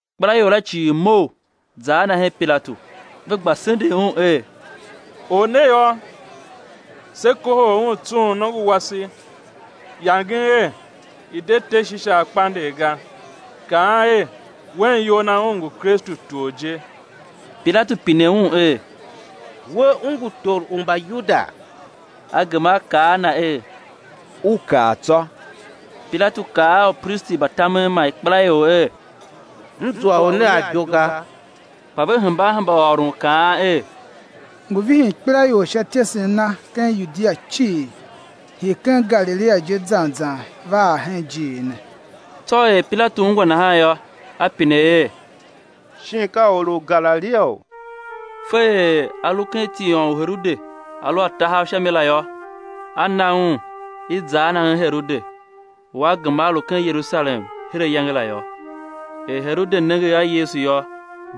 Ikpelaior la cii mough, za a Na hen Pilatu. Ve gba sendegh Un er: Or ne yô, se kohol Un tsughun nongo wase, yangen er i̱ de te Shisar kpandegh ga, kaan er, Wen iyol Na Un ngu Kristu tor je. Pilatu pine Un er: We, U ngu tor u Mbayuda? A gema A kaa a na er: U kaa tsô. Pilatu kaa a upristi mba tamen man ikpelaior er: M zua or ne a ibo ga. Kpa ve hemba a hemba ôron kaan er: Ngu vihin ikpelaior sha ityesen Na ken Yudia cii, hii ken Galilia je zan zan va ar hen ijiir ne. Tsô er Pilatu ungwa nahan yô, a pine er, shin ka or u Galiliaou? Fe er A lu ken tiôn u Herode a lu a tahav sha mi la yô, a na Un, i̱ za a Na hen Herode, u a gema a lu ken Yerusalem her ayange la yô. Er Herode nenge a Yesu yô,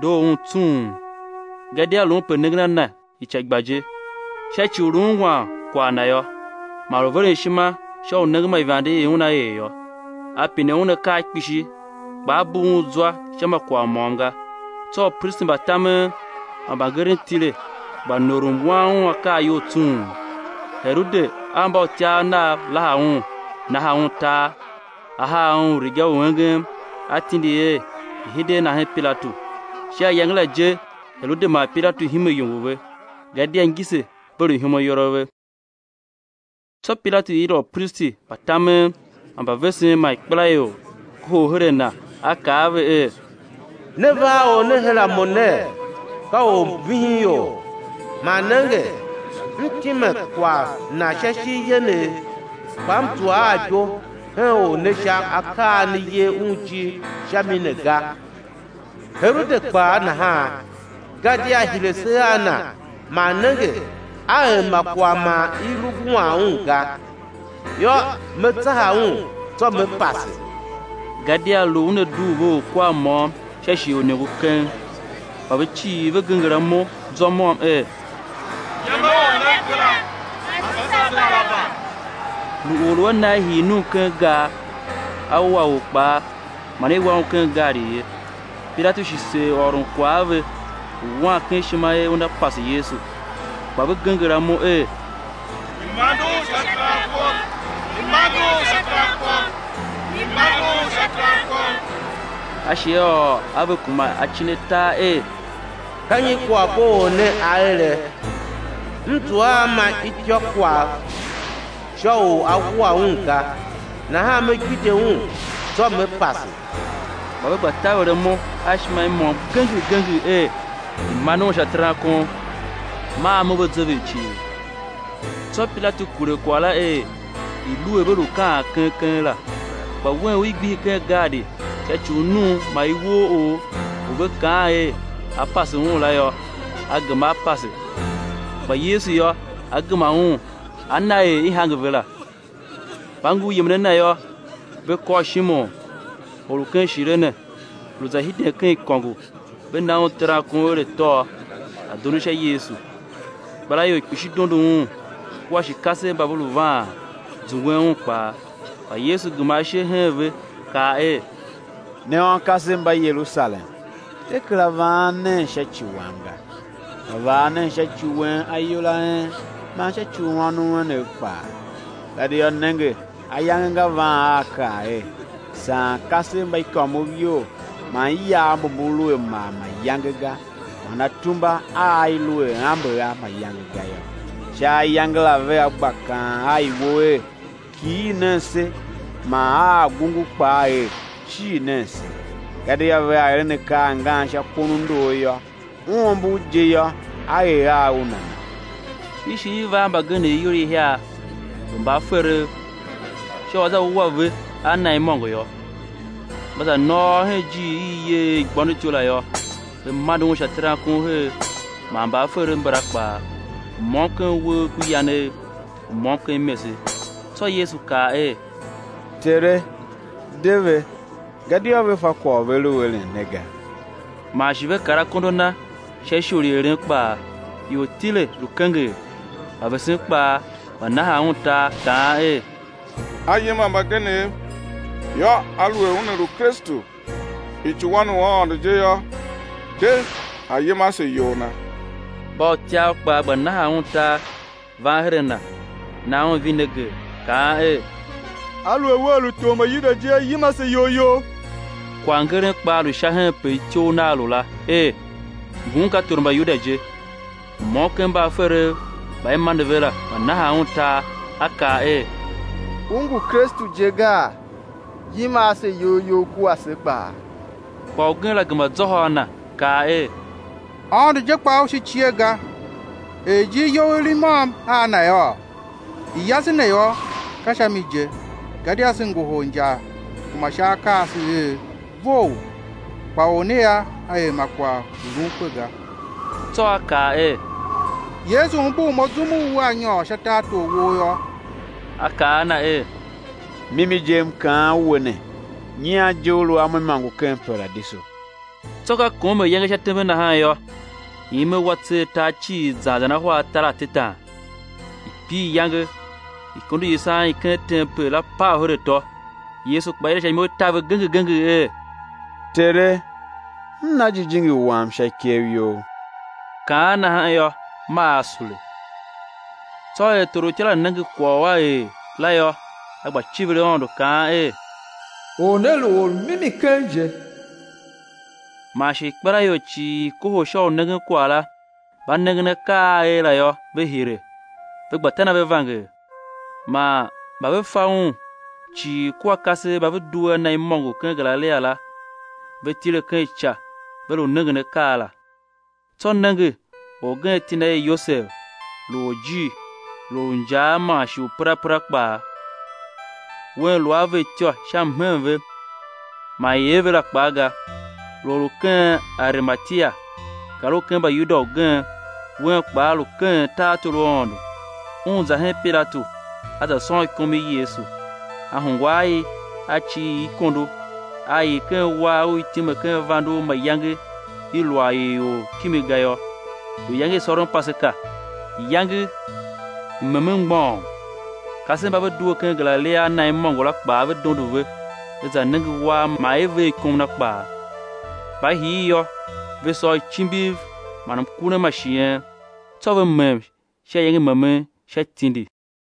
doo un tsung, gadia lu un pe nengen a Na ica i gba je, sha ci u lu ungwan kwagh Na yô; man lu veren ishima sha u nengen ma ivande i Una er yô. A pine Un akaa kpishi; kpa A bugh un zwa sha ma kwagh môm ga. Tsô upristi mba tamen man mbangeren tile, gba norom wan Un akaa iyol tsung. Herode a mbautyav nav laha Un, naha Un tar; a haa Un riga u engem, a tindi er, i̱ hide a Na hen Pilatu. Sha iyange la je Herode man Pilatu hime iyongo ve, gadia ngise ve lu ihom ayol a ve. Tsô Pilatu yila upristi mba tamen man mbavesen man ikpelaior kohol her a na, a kaa a ve er: Ne va a or ne her a mo ner, ka or u vihin ior; man nenge, m time kwagh Na sha ishigh yenegh, kpa m zua a ibo hen Or ne sha akaa a ne yer Un ijir sha mi ne ga, Herode kpaa nahan; gadia a hire se a Na man nenge, A er ma kwagh man i lu wuan un ga. Yô, me tsaha Un, tsô me pase; gadia lu u una dugh ve orkwar môm sha shighe u iniongo keng. Kpa ve cii ve genger imo zwa môm er: Yem a or ne kera, pase se Baraba; lu or u a na i hii num ken gar a wua or kpaa, man i wa un ken gaadi ye. Pilatu shi seer ôron kwagh a ve, lu wan ken ishima er una pase Yesu. Kpa ve genger imo er: I̱ mande Un sha terankon, i̱ mande Un sha terankon. A shi a ôr a ve kuma acin atar er: Ka nyi kwaghbo Or ne a ere? M zua a ma ityôkwagh sha u á wua Un ga; nahan me gbidye Un, tsô me pase. Kpa ve gba taver imo a ishima i môm genger genger er, i̱ mande Un sha terankon; maa amo ve zever cii. Tsô Pilatu kure kwagh la er, i̱ lu er ve kaan keng keng la. Kpa wen u i gbihi ken gaadi sha ci u num man iwooor, u ve kaan er a̱ pase un la yô, a gema a pase; kpa Yesu yô, a gema Un a na er i hange ve la. Mba ngur yemen a Na yô, ve kôr Shimon, or u ken Shirene, lu za hiden ken ikôngo, ve na un terankon er a̱ tôô, a̱ dondo sha Yesu. Ikpelaior kpishi dondo Un, kua shi kasev mba ve lu vaan, zungwen Un kpaa. Kpa Yesu gema ashe hen ve, kaa er: Ne ônkasev mba Yerusalem, de kera vaan nen sha ci Wam ga, kpa vaa nen sha ci wen ayol a en man sha ci u ônov enev kpaa. Gadia nenge, ayange nga van a á kaa er: Saan kasev mba ikômov iyol, man iyav mbu mbu lu a mar mayange ga, man atumba a i lu a ambe a mayange ga yô. Sha ayange la vea gba kaan a iwo er: Kighir nen se! Man a agungu kpaa er: Cir nen se! Gadia vea eren akaa ngan sha kon u ndor yô, u ombor je yô, á er a u nana? I shi i va a mbagenev ior ihiar, lu mbaaferev, sha u á za wua ve a Na imôngo yô. Mba za nôôr hen ijiir i i yer er Igbôndotyou la yô, ve mande Un sha terankon her, man mbaaferev mbala kpaa, u môm ken uwegh ku yanegh, u môm ken imese. Tsô Yesu kaa er: Tere, de ve, gadia ve fa kwagh u ve lu eren ne ga. Man shi ve kar akondo a Na sha ishor i eren kpaa. Ior tile, lu kenger. Mbavesen kpaa gba nahan Un tar, kaan er: A yima mbagenev, yô, aluer Una lu Kristu, icuwan u Aôndo je yô, de, A̱ yima ase iyol Na! Mbautyav kpaa gba nahan Un tar, van her a Na, nan Un vineger, kaan er: Aluer Wea lu tor u Mbayuda je yô, yima ase iyol You! Kwaghngeren kpaa lu sha henpe ityough Nagh lu la, er: Ngun ka tor u Mbayuda je. U môm ken mbaaferev mba i mande ve la, gba nahan Un tar, a kaa er: U ngu Kristu je gaa? Yima ase iyol You kua se kpaa. Kpa ugen la gema zôhô a na, kaa er: Aôndo je kpaa u shi cie ga, er ijir you i lu i môm a Na yôô? I yase ne yô, ka sha mi je, gadia se ngohol injar kuma sha akaa a se er vough, kpa Or ne yô, A er ma kwagh u lun kpe ga. Tsô a kaa er: Yesu, umbur mo zum u Wea nyôr sha tartor Wou yô. A kaa a na er: Mimi je M kaan we ne, nyian je ú lu a Mo imôngo ken Paradiso. Tsô ka kom er iyange sha tembe nahan yô, ime wa tser tar cii zan zan ahwa atar atetan; i pir iyange; ikondo i yisan i ken tempel la pav her atô. Yesu kpaa yila sha imo i taver genger genger er: Tere, M na jijingi Wam sha ikev You. Kaan nahan yô, maa A sule. Tsô er torutya la nenge kwagh u a er la yô, a gba civir Aôndo, kaan er Or ne lu Or u mimi keng je. Man shi ikpelaior cii i i kohol sha u nengen kwagh la, mba nengen akaa a a er la yô, ve hire, ve gba tan ave vanger. Man mba ve fa Un cii kua kasev mba ve due a Na imôngo ken Galilia la, ve tile ken ica, ve lu nengen akaa la. Tsô nenge, orgen iti na er Yosev, lu orjir, lu or u injaa man shi u perapera kpaa, un lu a ve ityô sha mhen ve man ier ve la kpaa ga; lu or u ken Arimatia, gar u Mbayuda ugen, wen kpaa lu keghen tartor u Aôndo. Un za hen Pilatu, a za sôn ikom i Yesu. A hungwa a i, a cir i ikondo, a ii ken uwar u i time ken vande u mayange i lu a ii or kimi ga yô. Lu iyange i sôron Paseka, iyange i memen mgbôghom. Kasev mba ve due ken Galilia a Na imôngo la kpaa ve dondo ve, ve za nenge uwar man er i ver ikom Na kpaa. Mba hir yô, ve sôr icimbiv man mkurem ma shighen. Tsô ve mem sha iyange i memen sha tindi.